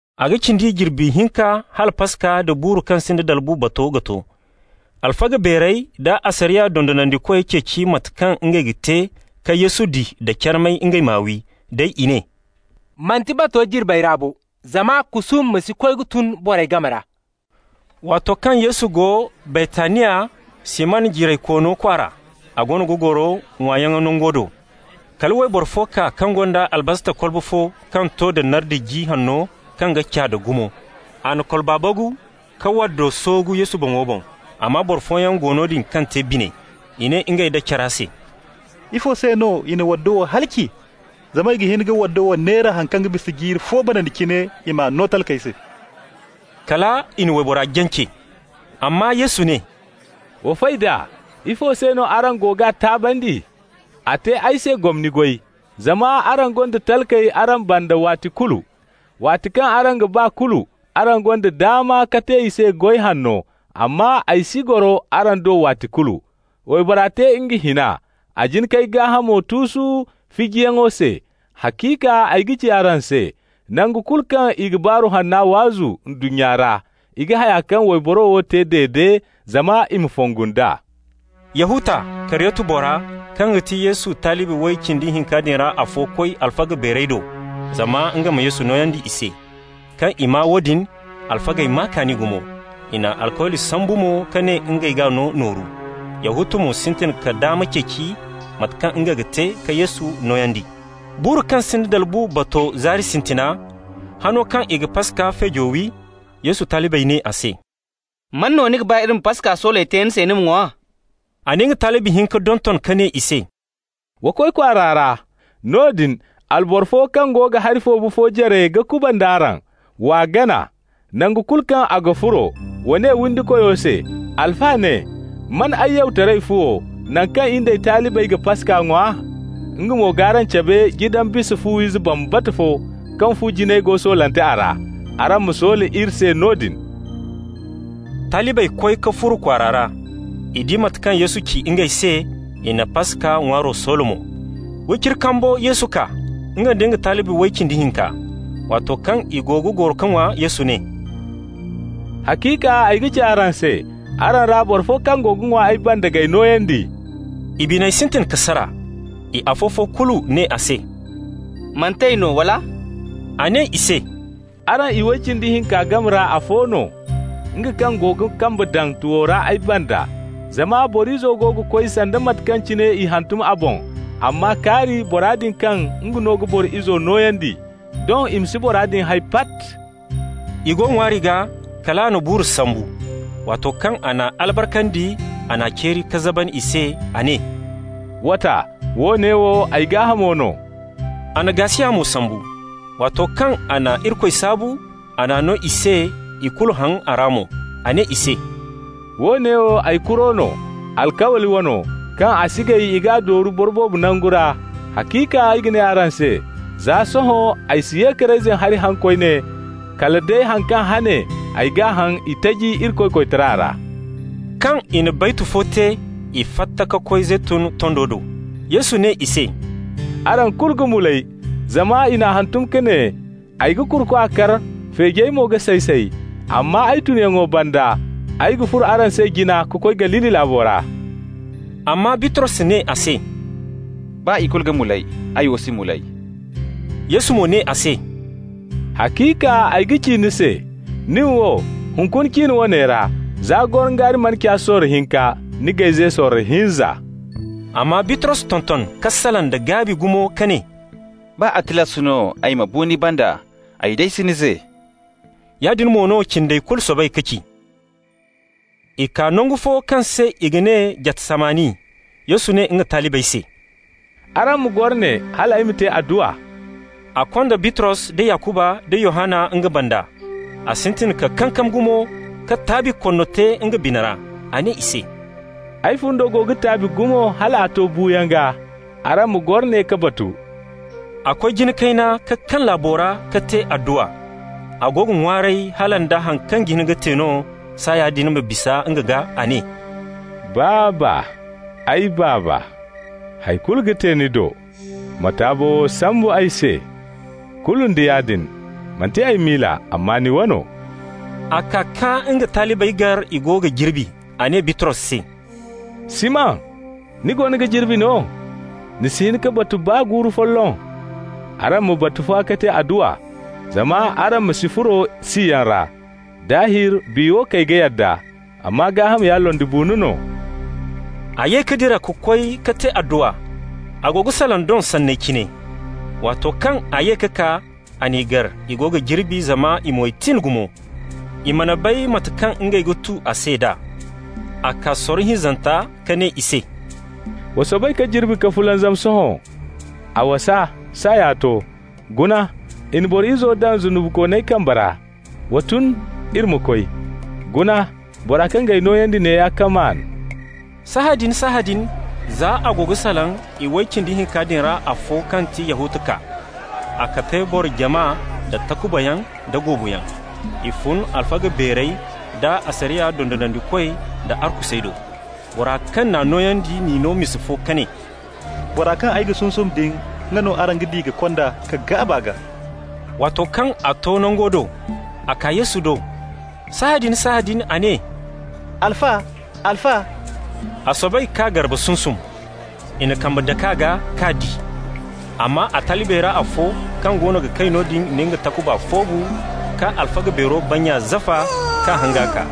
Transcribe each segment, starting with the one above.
A ga cindi jirbi hinka hala Paska nda buuru kaŋ sinda dalbu bato ga to. Alfaga beerey da asariya dondonandikoy ceeci mate kaŋ ngey ga te ka Yesu di da carmay, ngey m'a wi. Day i ne: «Manti bato jirbey ra bo, zama kusuuma ma si koy ka tun borey game ra.» Waato kaŋ Yesu go Baytaniya, Siman jiraykoono kwaara, a goono ga goro ŋwaayaŋ nango do. Kala wayboro fo kaa kaŋ gonda albasta kolbo fo kaŋ to da nardi ji hanno kaŋ ga caada gumo. A na kolba bagu ka waddo soogu Yesu boŋo boŋ. Amma boro fooyaŋ go noodin kaŋ te bine. I ne ngey nda care se: «Ifo se no i na waddo wo halaci? Zama i ga hin ka waddo wo neera haŋ kaŋ ga bisa jiiri fo banandi cine, i m'a no talkey se.» Kala i na waybora jance. Amma Yesu ne: «Wa fay d'a. Ifo se no araŋ go g'a taabandi? A te ay se gomni goy. Zama araŋ gonda talkey araŋ banda waati kulu. Waati kaŋ araŋ ga ba kulu, araŋ gonda daama ka te i se goy hanno, amma ay si goro araŋ do waati kulu. Waybora te nga hina, a jin k'ay gaahamo tuusu fijiyaŋo se. Haciika ay ga ci araŋ se: nangu kulu kaŋ i ga Baaru Hanna waazu ndunnya ra, i ga haya kaŋ wayboro wo te dede zama i ma fongu nd'a.» Yahuta, Kariyoti bora, kaŋ ga ti Yesu talibi way cindi hinka din ra afo, koy alfa beerey do zama nga ma Yesu nooyandi i se. Kaŋ i maa woodin, alfagey maa kaani gumo. I na alkawli sambu mo ka ne ngey g'a no nooru. Yahuta mo sintin ka daama ceeci mate kaŋ nga ga te ka Yesu nooyandi. Buuru kaŋ sinda dalbu bato zaari sintina, hano kaŋ i ga Paska feejo wi, Yesu talibey ne a se: «Man no ni ga ba iri ma Paska sooley te ni se ni ma ŋwa?» A na nga talibi hinka donton ka ne i se: «Wa koy kwaara ra. Noodin alboro fo kaŋ go ga hari foobu fo jare ga kubanda araŋ. W'a gana. Nangu kulu kaŋ a ga furo, wa ne windikoyo se: ‹Alfa ne: Man ay yawtaray fuwo, naŋ kaŋ in d'ay talibey ga Paska ŋwa?› Nga mo g'araŋ cabe jidan bisa fu-ize bambata fo kaŋ fu jinay go soolante a ra. Araŋ ma soola iri se noodin.» Talibey koy ka furo kwaara ra. I di mate kaŋ Yesu ci ngey se, i na Paska ŋwaaro soola mo. Wiciri kambo Yesu kaa, nga nda talibi way cindi hinka. Waato kaŋ i go ga goro ka ŋwa, Yesu ne: «Haciika ay ga ci araŋ se: araŋ ra boro fo kaŋ go ga ŋwa ay banda g'ay nooyandi.» I biney sintin ka sara. I afo-fo kulu ne a se: «Manti ay no, wala?» A ne i se: «Araŋ iway cindi hinka game ra afo no, nga kaŋ go ga kambe daŋ tuwo ra ay banda. Zama Boro Izo go ga koy sanda mate kaŋ cine i hantum a boŋ, amma kaari bora din kaŋ nga no ga Boro Izo nooyandi! Doŋ i ma si bora din hay pat.» I go ŋwaari gaa, kal a na buuru sambu. Waato kaŋ a n'a albarkandi, a n'a ceeri ka zaban i se. A ne: «W'a ta, woone wo ay gaahamo no.» A na gaasiya mo sambu. Waato kaŋ a na Irikoy saabu, a n'a no i se, i kulu haŋ a ra mo. A ne i se: «Woone wo ay kuro no, alkawli wano, kaŋ a si gay i g'a dooru boro boobo nangu ra. Haciika ay ga ne araŋ se: Za sohõ ay si ye ka reyzin hari haŋ koyne kala day han kaŋ hane ay g'a haŋ itaji Irikoy koytara ra.» Kaŋ i na baytu fo te, i fatta ka koy Zeytun tondo do. Yesu ne i se: «Araŋ kulu ga mulay, zama i n'a hantum ka ne: ‹Ay ga kurukwa kar, feejey mo ga say-say.› Amma ay tunyaŋo banda, ay ga furo araŋ se jine ka koy Galili laabo ra.» Amma Bitros ne a se: «Baa i kulu ga mulay, ay wo si mulay.» Yesu mo ne a se: «Haciika ay ga ci ni se: nin wo, hunkuna cin woone ra, za gorongaari mana ca sorro hinka, ni g'ay ze sorro hinza.» Amma Bitros tonton ka salaŋ da gaabi gumo ka ne: «Baa a tilas no ay ma bu ni banda, ay day si ni ze.» Yaadin mo no cindey kulu soobay ka ci. I kaa nangu fo kaŋ se i ga ne Jatsamani. Yesu ne nga talibey se: «Araŋ ma goro ne hal ay ma te adduwa.» A konda Bitros da Yakuba nda Yohanna nga banda. A sintin ka kankam gumo ka taabi konno te nga bina ra. A ne i se: «Ay fundo go ga taabi gumo hal a to buuyaŋ gaa. Araŋ ma goro ne ka batu.» A koy jina kayna ka kaŋ laabo ra ka te adduwa. A go ga ŋwaaray hala nda haŋ kaŋ ga hin ka te no, saaya din ma bisa nga gaa. A ne: «Baaba, ay Baaba, hay kulu ga te ni do. Ma taabo wo sambu ay se. Kulu nda yaadin, manti ay miila, amma ni wano.» A kaa ka nga talibey gar i go ga jirbi. A ne Bitros se: «Siman, ni goono ga jirbi no? Ni si hin ka batu baa guuru folloŋ? Araŋ ma batu fa ka te adduwa, zama araŋ ma si furo siyaŋ ra. Daahir biya wo kay ga yadda, amma gaaham ya londibuuno no.» A ye ka dira ka koy ka te adduwa, a go ga salaŋ doŋ sanney cine. Waato kaŋ a ye ka kaa, a n'i gar i go ga jirbi, zama i moy tin gumo. I mana bay mate kaŋ ngey ga tu a se d'a. A kaa sorro hinzanta ka ne i se: «Wa soobay ka jirbi ka fulanzam sohõ. A wasa. Saaya to. Guna, i na Boro Izo daŋ zunubikooney kambey ra. Wa tun, iri ma koy. Guna, bora kaŋ g'ay nooyandi neeya ka maan.» Sahãadin-sahãadin, za a go ga salaŋ, iway cindi hinka din ra afo kaŋ ti Yahuta kaa. A kande boro jama da takubayaŋ da goobuyaŋ. I fun alfaga beerey da asariya dondonandikoy da arkusey do. Bora kaŋ n'a nooyandi n'i no misa fo ka ne: «Bora kaŋ ay g'a sunsum din, nga no araŋ ga di ka kond'a ka gaab'a gaa.» Waato kaŋ a to nango do, a kaa Yesu do. Sahãadin-sahãadin a ne: «Alfa, Alfa!» A soobay k'a garba sunsum. I na kambe dak'a gaa k'a di. Amma a talibey ra afo kaŋ goono ga kay noodin na nga takuba foobu ka alfaga beero bannya zafa k'a hanga kaa.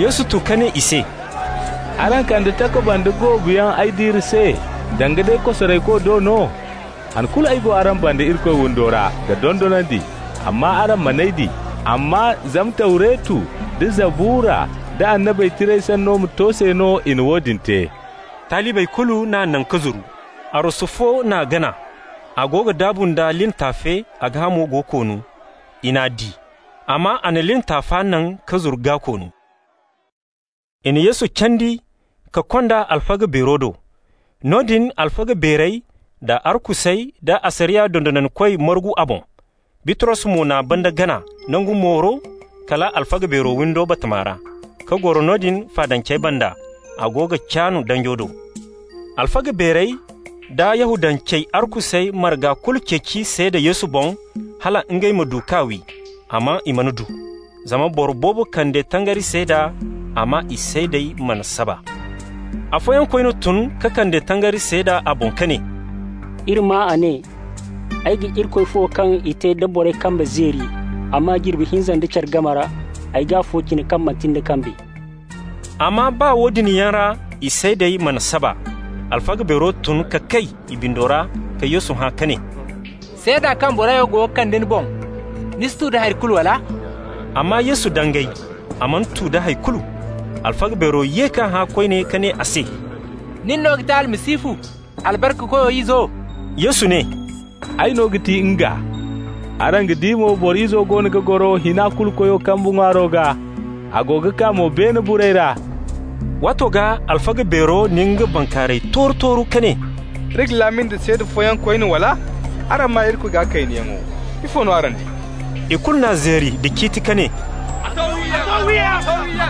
Yesu tu ka ne i se: «Araŋ kande takuba nda goobu yaŋ ay diire se danga day kosarayko do no? Han kulu ay go araŋ banda Irikoy windo ra ga dondonandi, amma araŋ man'ay di. Amma zama Tawretu nda Zabura nda Annabey Tirey sanno ma to se no i na woodin te.» Talibey kulu n'a naŋ ka zuru. Arwasu fo n'a gana. A go ga daabu nda lin taafe, a gaahamo go koonu. I n'a di, amma a na lin taafa naŋ ka zuru gaa-koonu. I na Yesu candi ka kond'a alfaga beero do. Noodin alfaga beerey da arkusey da asariya dondonandikoy margu a boŋ. Bitros mo na banda gana nangu mooru kala alfaga beero windo batama ra, ka goro noodin faadancey banda. A go ga caan danjo do. Alfaga beerey da Yahudancey arkusey marga kulu ceeci seeda Yesu boŋ hala ngey ma du k'a wi, amma i mana du. Zama boro boobo kande tangari seeda, amma i seedey mana saba. Afooyaŋ koyne tun ka kande tangari seeda a boŋ ka ne: «Iri maa a ne: ‹Ay ga Irikoy fu wo kaŋ i te da borey kambey zeeri, amma jirbi hinza nda care game ra ay g'afo cina kaŋ manti nda kambey.›» Amma baa woodin yaŋ ra, i seedey mana saba. Alfaga beero tun ka kay i bindo ra ka Yesu hã ka ne: «Seeda kaŋ borey wo go ga kande ni boŋ, ni si tu da hay kulu, wala?» Amma Yesu dangay, a mana tu da hay kulu. Alfaga beero ye k'a hã koyne ka ne a se: «Nin no ga ti Almasihu, Albarkakoyo izo?» Yesu ne: «Ay no ga ti NGA. Araŋ ga di mo Boro Izo goono ga goro Hina-Kulu-Koyo kambe ŋwaaro gaa, a go ga kaa mo beene burey ra.» Waato gaa alfaga beero na nga bankaaray tooru-tooru ka ne: «Iri ga laami nda seeda fooyaŋ koyne, wala? Araŋ maa Irikoy gaa kaynayaŋo. Ifo no araŋ di?» I kulu n'a zeeri nda ciiti ka ne: «A to wiyaŋ!»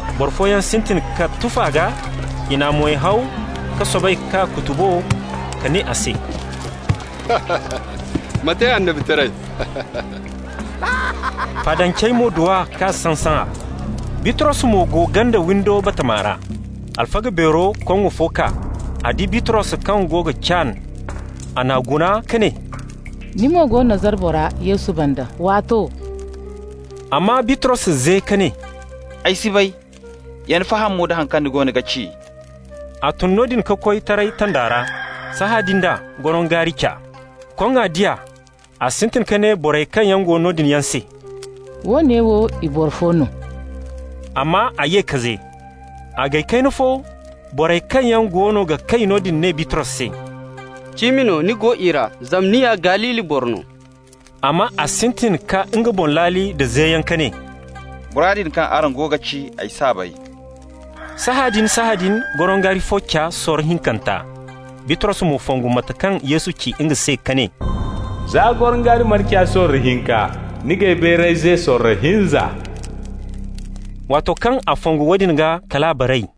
Boro fooyaŋ sintin ka tuf'a gaa, i n'a moy haw ka soobay k'a kutubo ka ne a se: «Ma te annabitaray!» Faadancey mo du a k'a saŋ-saŋa. Bitros mo go ganda windo batama ra. Alfaga beero koŋŋo fo kaa. A di Bitros kaŋ go ga caan. A n'a guna ka ne: «Ni mo go Nazara bora, Yesu banda waato.» Amma Bitros ze ka ne: «Ay si bay, yana faham mo da haŋ kaŋ ni goono ga ci.» A tun noodin ka koy taray tanda ra. Sahãadin d'a, gorongaari ca. Koŋŋa di a, a sintin ka ne borey kaŋ go noodin yaŋ se: «Woone wo i boro fo no.» Amma a ye ka ze. A gay kayna fo, borey kaŋ yaŋ goono ga kay noodin ne Bitros se: «Cimi no ni go i ra, zama ni ya Galili boro no.» Amma a sintin ka nga boŋ laali nda zeyaŋ ka ne: «Bora din kaŋ araŋ go ga ci, ay s'a bay.» Sahãadin-sahãadin gorongaari fo ca sorro hinkanta. Bitros mo fongu mate kaŋ Yesu ci nga se ka ne: «Za gorongaari mana ca sorro hinka, ni g'ay bayray ze sorro hinza.» Waato kaŋ a fongu woodin gaa, kal a baray.